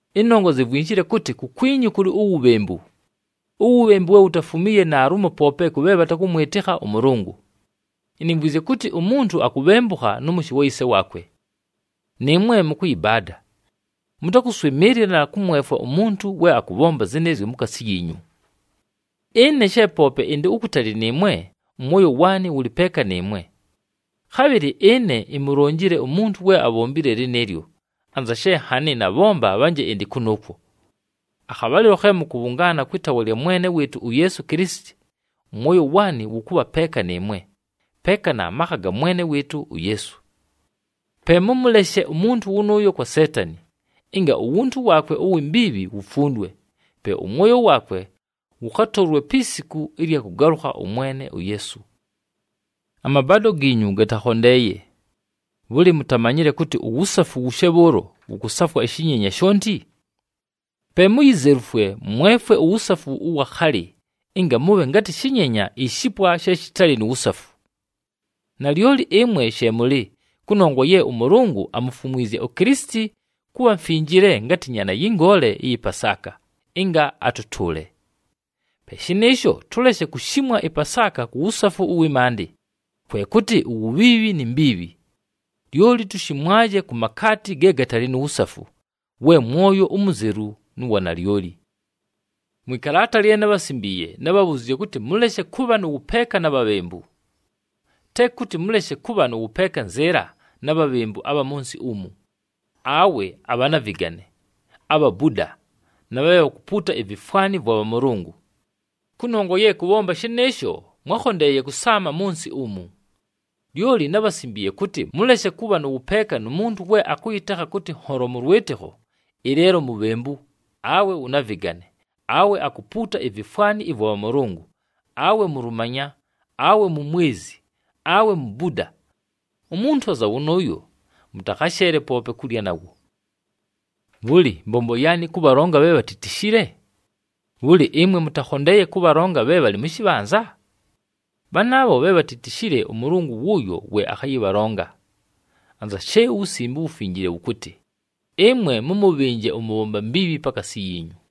Ɨnongwa zivwinshile kʉtɨ, kukwinyu kʉlɨ uwubhembu. Uwubhembu we wutafumiiye naalumo poope kʉ bhe bhatakʉmwɨtɨkha ʉMʉlʉngʉ. Inimvwizye kʉtɨ umuntu akubhembukha nʉ mʉshɨ wa yise waakwe. Nɨɨmwe mʉkʉyɨbaada! Mʉtakʉswɨmɨɨlɨla na kʉmwefwa umuntu we akʉbhomba zɨnɨɨzyo mukaasi yiinyu! Ɨne she poope ɨndɨ ukutali nɨɨmwe, ʉmwoyo waanɨ wʉlɨ peeka nɨɨmwe. Khabhɨlɨ ɨne imulonjile umuntu we abhombile lɨnɨɨlyo, anza she nhanɨ nabhomba bhanje ɨndɨ kʉnʉʉkwo. Akhabhalɨlo khe mʉkʉbhʉngaana kwɨ taawa lya Mwene wɨɨtʉ uYeesu Kilisiti, ʉmwoyo waanɨ wʉkʉbha peeka nɨɨmwe, peeka na makha ga Mwene wɨɨtʉ uYeesu. Pe mʉmʉleshe umuntu wʉnʉʉyo kwa Seetani, ɨnga uwuntu waakwe uwi mbiibhi wufundwe, pe ʉmwoyo waakwe wʉkhatʉʉlwe pi siku ɨlya kʉgalʉkha ʉMwene uYeesu. Amabaado giinyu gatakhondeeye. Bhʉlɨ, mutamanyile kʉtɨ uwusafu wushe bhʉʉlo, wʉkʉsafwa ɨshɨnyenya shonti? Pe muyizelufwe, mwefwe uwusafu ʉwa khalɨ, ɨnga mʉbhe ngatɨ shɨnyenya ishipwa she shɨtalɨ nu wusafu. Nalyoli ɨmwe she mʉlɨ, kʉnongwa ye ʉMʉlʉngʉ amufumwizye uKilisiti kʉbha mfinjile ngatɨ Nyaana yɨ Ngoole ɨyɨ Pasaaka, ɨnga atʉtʉʉle. Pe shɨnɨɨsho, tʉleshe kushimwa ɨPasaaka ku wusafu ʉwɨ maandɨ, kwe kʉtɨ uwubhiibhi ni mbiibhi. Lyoli tushimwaje ku makaati ge gatalɨ nu wusafu, we mwoyo umuzelu nʉ wa nalyoli. Mwɨ kalaata lye nábhasimbiiye, nábhabhuziizye kʉtɨ, mʉleshe kʉbha nʉ wʉpeeka na bhabhembu. Te kʉtɨ mʉleshe kʉbha nʉ wʉpeeka nzɨɨla na bhabhembu abha mʉ nsɨ umu, awe abhanavɨgane, abhabuda, na bhe bhakupuuta ivifwani vwa bhamʉlʉngʉ. Kʉnongwa ye kʉbhomba shɨnɨɨsho mwákhondeeye kʉsaama mʉ nsɨ umu. Lyoli nábhasimbiiye kʉtɨ: mʉleshe kʉbha nʉ wʉpeeka nu muntu we akʉyɨtekha kʉtɨ nholo mʉ lwɨtɨkho, ɨleelo mubhembu, awe wʉ navɨgane, awe akupuuta ivifwani ɨvwa bhamʉlʉngʉ, awe mulumanya, awe mumwezi, awe mubuda. Umuntu anza wʉnʉʉyo, mʉtakhasheele poope kulya nawo. Bhʉlɨ, mbombo yaanɨ kʉbhalonga bhe bhatitishile? Bhʉlɨ ɨmwe mʉtakhondeeye kʉbhalonga bhe bhalɨ mʉ shɨbhanza? Bhanaabho bhe bhatitishile ʉMʉlʉngʉ wʉʉyo we akhayɨbhalonga. Anza she uWusimbe uWufinjile wʉkʉtɨ, “Ɨmwe mʉmʉbhɨnje ʉmʉbhomba mbiibhi pakaasi yiinyu.”